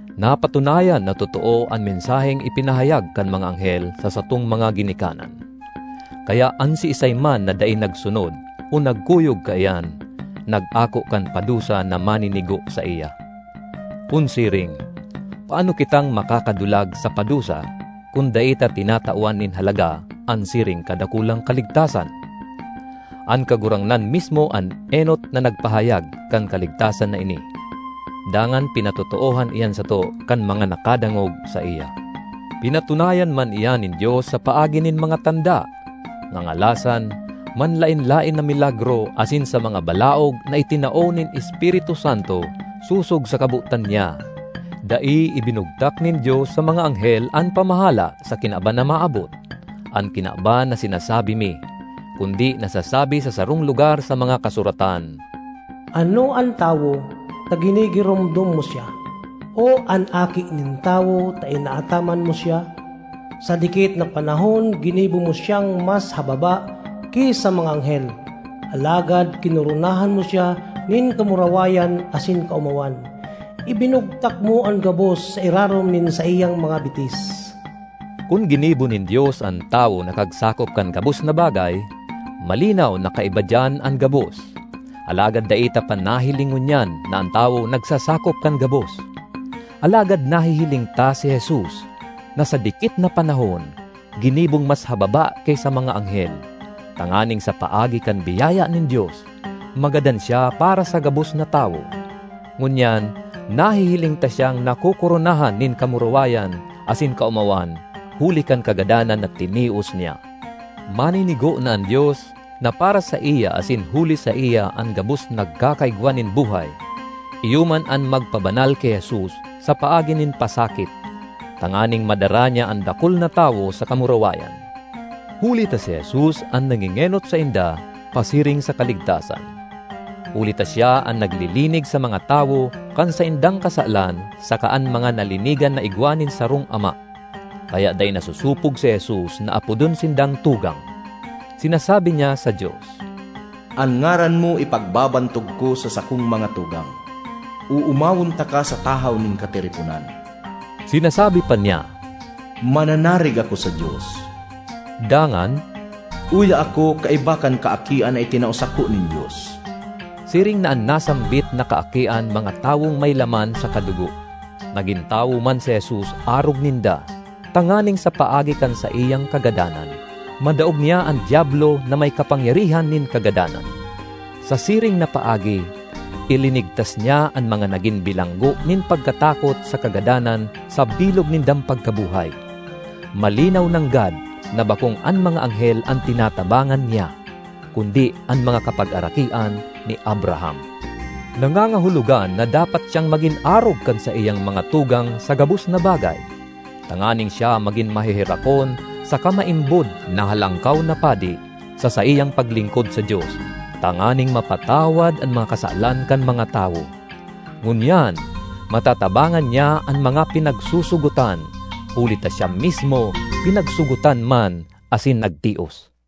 Napatunayan na totoo an mensaheng ipinahayag kan mga anghel sa satong mga ginikanan. Kaya an siisay man na dai nagsunod o nagkuyog kaiyan nag-ako kan padusa na maninigo saiya. Kun siring, paano kitang makakadulag sa padusa kun dai ta tinatawan nin halaga an siring kadakulang kaligtasan? An Kagurangnan mismo an enot na nagpahayag kan kaligtasan na ini, dangan pinatotoohan iyan sato kan mga nakadangog saiya. Pinatunayan man iyan nin Dios sa paagi nin mga tanda, ngangalasan, manlaen-laen na milagro asin sa mga balaog na itinao nin Espiritu Santo sosog sa kabotan niya. Dai ibinugtak nin Dios sa mga anghel an pamahala sa kinaban na maabot—an kinaban na sinasabi mi. Kundi nasasabi sa sarong lugar sa mga Kasuratan, “Ano an tawo, ta ginigiromdom mo siya; o an aki nin tawo ta inaataman mo siya? Sa dikit na panahon ginibo mo siyang mas hababa ki sa mga anghel, alagad kinoronahan mo siya nin kamurawayan asin kaomawan; ibinugtak mo an gabos sa irarom nin saiyang mga bitis.” Kun ginibo nin Dios an tawo na kagsakop kan gabos na bagay, malinaw na kaiba diyan an gabos. Alagad dai ta pa nahiling ngunyan na an tawo nagsasakop kan gabos. Alagad nahihiling ta si Jesus, na sa dikit na panahon ginibong mas hababa ki sa mga anghel, tanganing sa paagi kan biyaya nin Dios, magadan siya para sa gabos na tawo. Ngunyan nahihiling ta siyang nakokoronahan nin kamurawayan asin kaomawan huli kan kagadanan na tinios niya. Maninigo na an Dios, na para saiya asin huli saiya an gabos nagkakaigwa nin buhay, iyo man an magpabanal ki Jesus sa paagi nin pasakit, tanganing madara niya an dakul na tawo sa kamurawayan. Huli ta si Jesus an nangengenot sainda pasiring sa kaligtasan. Huli ta siya an naglilinig sa mga tawo kan saindang kasalan saka an mga nalinigan na igwa nin sarong Ama. Kaya dai nasosopog si Jesus na apodon sindang tugang. Sinasabi niya sa Dios, “An ngaran mo ipagbabantog ko sa sakong mga tugang; oomawon taka sa tahaw nin katiriponan.” Sinasabi pa niya, “Mananarig ako sa Dios.” Dangan, “Uya ako kaiba kan kaakian na itinao sako nin Dios.” Siring na an nasambit na kaakian mga tawong may laman saka dugo, nagin tawo man si Jesus arog ninda, tanganing sa paagi kan saiyang kagadanan, madaog niya an Diablo na may kapangyarihan nin kagadanan. Sa siring na paagi, ilinigtas niya an mga nagin bilanggo nin pagkatakot sa kagadanan sa bilog nindang pagkabuhay. Malinaw nanggad na bakong an mga anghel an tinatabangan niya, kundi an mga kapagarakian ni Abraham. Nangangahulogan na dapat siyang magin arog kan saiyang mga tugang sa gabos na bagay, tanganing siya magin maheherakon saka maimbod na Halangkaw na Padi sa saiyang paglingkod sa Dios, tanganing mapatawad an mga kasalan kan mga tawo. Ngunyan, matatabangan niya an mga pinagsosogotan, huli ta siya mismo pinagsogotan man asin nagtios.